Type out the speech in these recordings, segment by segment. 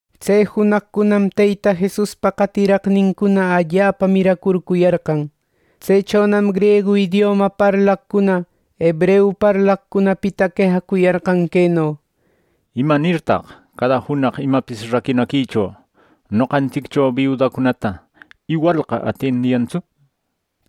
Tse junaqcunam Teyta Jesuspa qatiraqnincuna allapa miracurcuyarqan. Tsechonam griegu idioma parlaqcuna hebreu parlaqcunapita quejacuyarqan queno: —¿Imanirtaq cada junaq imapis raquinaquicho noqantsiccho biudacunata iwalqa atiendiyantsu? —nishpa.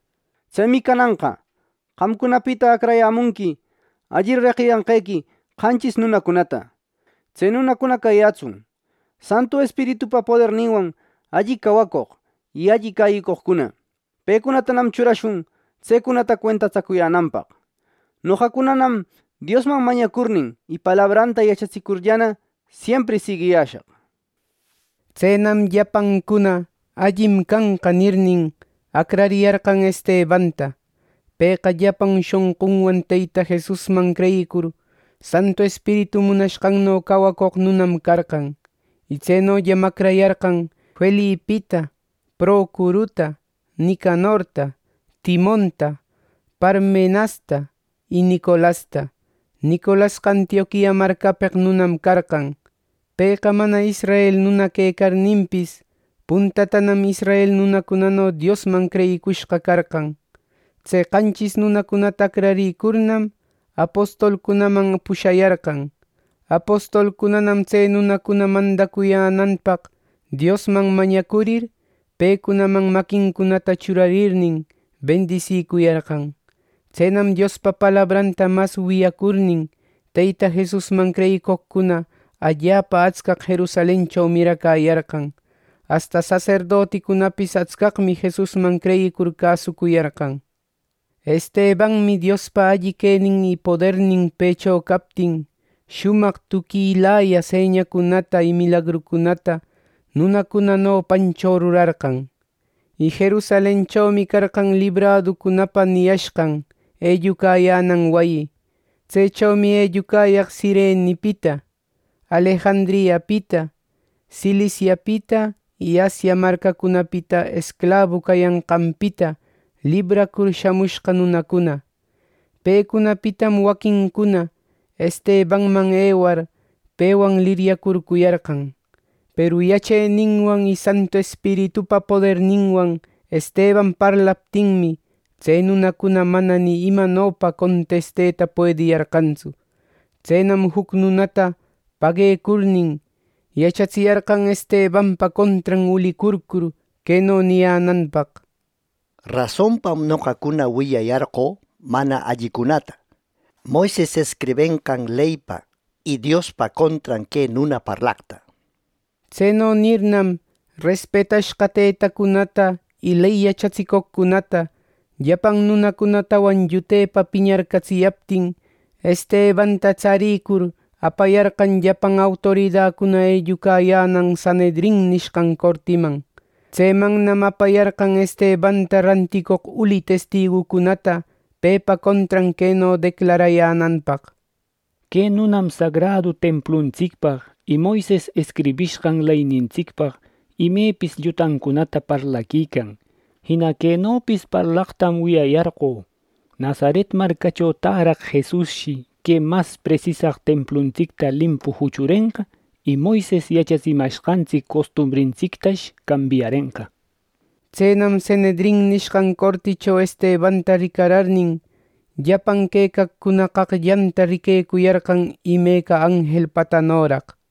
Tsemi cananqa qamcunapita acrayämunqui alli reqiyanqequi qanchis nunacunata. Tse nunacuna cayätsun Santu Espiritupa poderninwan alli cawacoq y alli cäyicoqcuna. Pecunatanam churashun tsecunata cuentatsacuyänanpaq. Noqacunanam Diosman mañacurnin y palabranta yachatsicurllana, siempri siguiyäshaq. Tsenam llapancuna “Allim canqa” nirnin, acrariyarqan Estebanta; pëqa llapan shonqunwan Teyta Jesusman creyicur, Santu Espiritu munashqanno cawacoq nunam carqan. Y tsenollam acrayarqan: Felipita, Procoruta, Nicanorta, Timonta, Parmenasta y Nicolasta. Nicolasqa Antioquia marcapeq nunam carqan. Pëqa mana israel nuna quecarninpis, puntatanam israel nunacunano Diosman creyicushqa carqan. Tse qanchis nunacunata acrarïcurnam, apostolcunaman pushayarqan. Apostolcunanam tse nunacuna mandacuyänanpaq Diosman mañacurir, pecunaman maquincunata churarnin, bendisicuyarqan. Tsenam Diospa palabranta mas wiyacurnin, Teyta Jesusman creyicoqcuna allapa atscaq Jerusalencho miracäyarqan; asta saserdoticunapis atscaqmi Jesusman creyicur cäsucuyarqan. Estebanmi Diospa alli quenin y podernin pëcho captin, shumaq tuquilaya señacunata y milagrucunata nunacuna nopancho rurarqan. Y Jerusalenchomi carqan Libraducunapa niyashqan ellucayänan wayi. Tsechomi ellucayaq Cirenepita, Alejandriapita, Ciliciapita y Asia marcacunapita esclabu cayanqanpita libracur shamushqa nunacuna. Pecunapitam waquincuna Estebanman ewar, pewan liryacurcuyarqan. Peru yacheninwan y Santu Espiritupa poderninwan Esteban parlaptinmi, tse nunacuna mana ni imanopa contesteta puediyarqantsu. Tsenam juc nunacunata paguecurnin, yachatsiyarqan Estebanpa contran ulicurcur, queno niyänanpaq: —Rasonpam noqacuna wiyayarqö mana allicunata Moises escribenqan leypa y Diospa contran que nuna parlaqta —nishpa. Tseno nirnam, respetashqa tëtacunata, ley yachatsicoqcunata, llapan nunacunatawan llutepa piñarcatsiyaptin, Estebanta tsarïcur, apayarqan llapan autoridacuna ellucayänan Sanhedrin nishqan cortiman. Tsemannam apayarqan Estebanta ranticoq uli testigucunata pepa contran queno declarayänanpaq: —Que nunam sagradu templuntsicpaq y Moises escribishqan leynintsicpaq imepis llutacunata parlaquican. Jina quenopis parlaqtam wiyayarqö: Nazaret marcacho täraq Jesusshi que mas presisaq templuntsicta limpu juchurenqa; y Moises yachatsimashqantsic costumbrintsictash cambiarenqa. Tsenam Sanhedrin nishqan corticho Estebanta ricararnin, llapan quecaqcuna qaqllanta riquecuyarqan imeca anjelpatanoraq.